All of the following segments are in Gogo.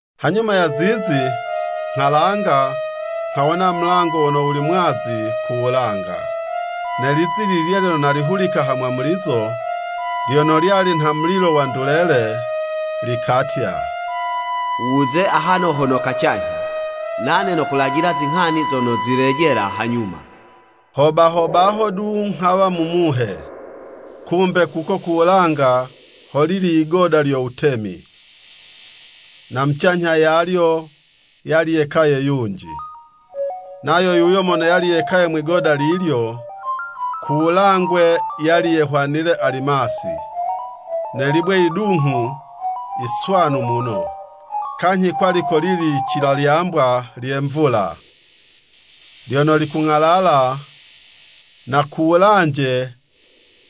Hanyuma ya zizi, nghalanga, nghawona mulango wono wuli mwazi ku wulanga. Ne lizi lililya lyono nalihulika hamwamulizo, lyono lyali nha mulilo wa ndulele, likatya, “Wuze ahano hono kacanyha, nane nokulajila zinghani zono zilejela hanyuma.” Ho baho baho du nghawa mu Muhe. Kumbe kuko ku wulanga holili yigoda lyo wutemi, na mucanyha yalyo, yali yekaye yunji. Nayo yuyo mono yali yekaye mwi'goda lilyo, ku wulangwe, yali yehwanile alimasi, ne libwe yidunghu yiswanu muno. Kanyhi kwali kolili licilalyambwa lye mvula, lyono likung'alala, na kuwulanje,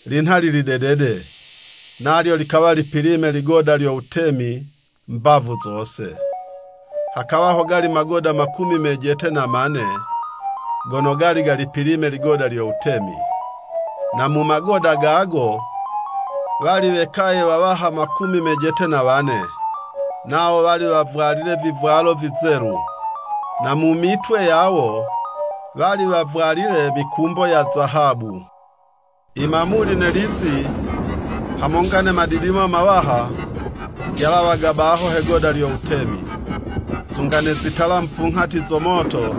linha lili dedede, nalyo likawa lipilime ligoda lyo wutemi mbavu zose. Hakawa hogali magoda makumi mejete na mane gono gali galipilime ligoda lyo wutemi, na mu magoda gago, wali wekaye wawaha makumi mejete na wane, nawo wali wavwalile vivwalo vizelu, na mu mitwe yawo, wali wavwalile mikumbo ya zahabu. I mamuli, ne lizi, hamonga ne madidimo mawaha, vyalawaga baho he'goda lyo wutemi. Sunga ne zitala mupunghati zo moto,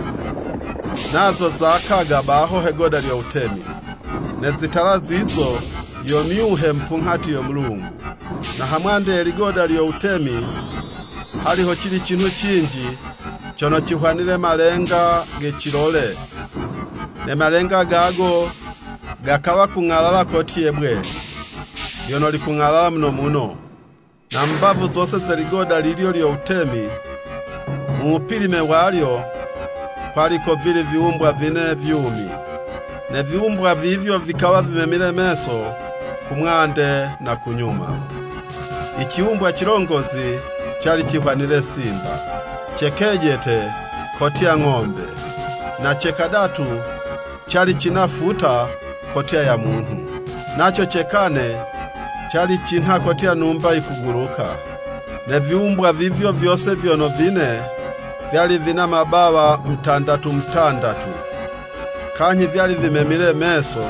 nazo zakaga baho he'goda lyo wutemi. Ne zitala zizo, yo myuhe mupunghati yo Mulungu. Na ha mwande ye ligoda lyo wutemi, hali ho cili cinhu cinji cono cihwanile malenga ga cilole, ne malenga gago gakawa gakung'alala kotye'bwe lyono likung'alala muno muno. Na mu mbavu zose ze ligoda lilyo lyo wutemi, mu wupilime walyo, kwali kovili viwumbwa vine vyumi. Ne viwumbwa vivyo vikawa vimemile meso, ku mwande na ku nyuma. I ciwumbwa cilongozi cali cihwanile simba, ce kejete kotya ng'ombe, na ce kadatu cali cina futa kotya ya munhu, naco ce kane, cali cinha kotya numba yikuguluka. Ne viwumbwa vivyo vyose vyono vine, vyali vina mabawa mutandatu mutandatu, kanyhi vyali vimemile meso,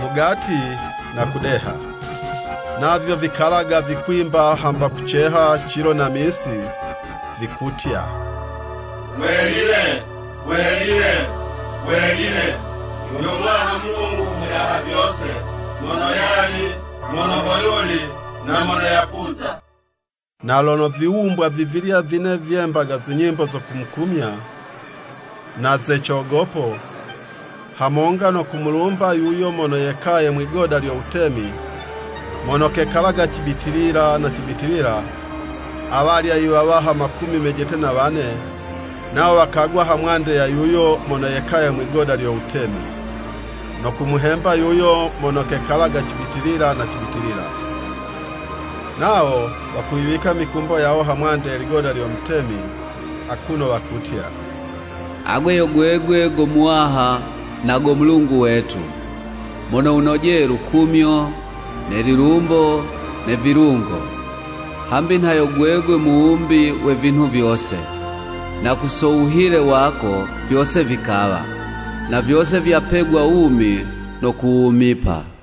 mugati na mudeha. Navyo vikalaga vikwimba hamba kuceha cilo ne misi, vikutya, “Welile, welile, welile, yo Muwaha Mulungu u Mudaha vyose mono yali, mono hoyuli, na mono yakuza.” Na lono viwumbwa vivilya vine vyembaga zinyimbo zo kumukumya, na ze cogopo, hamonga no kumulumba yuyo mono yekaye mwi'goda lyo wutemi, mono kekalaga cibitilila ne cibitilila, awalya i wawaha makumi mejete na wane, nawo wakagwa ha mwande ya yuyo mono yekaye mwi'goda lyo wutemi no kumuhemba yuyo mono kekalaga cibitilila ne cibitilila, nawo wakuyiwika mikumbo yawo ha mwande ye ligoda lyo wutemi akuno wakutya, “Agwe yo gwegwe go Muwaha nago Mulungu wetu, mono wunojeye lukumyo, ne lilumbo ne vilungo, hambi nha yo gwegwe muwumbi we vinhu vyose, na ku so wuhile wako, vyose vikawa, na vyose vyapegwa wumi no kuwumipa.”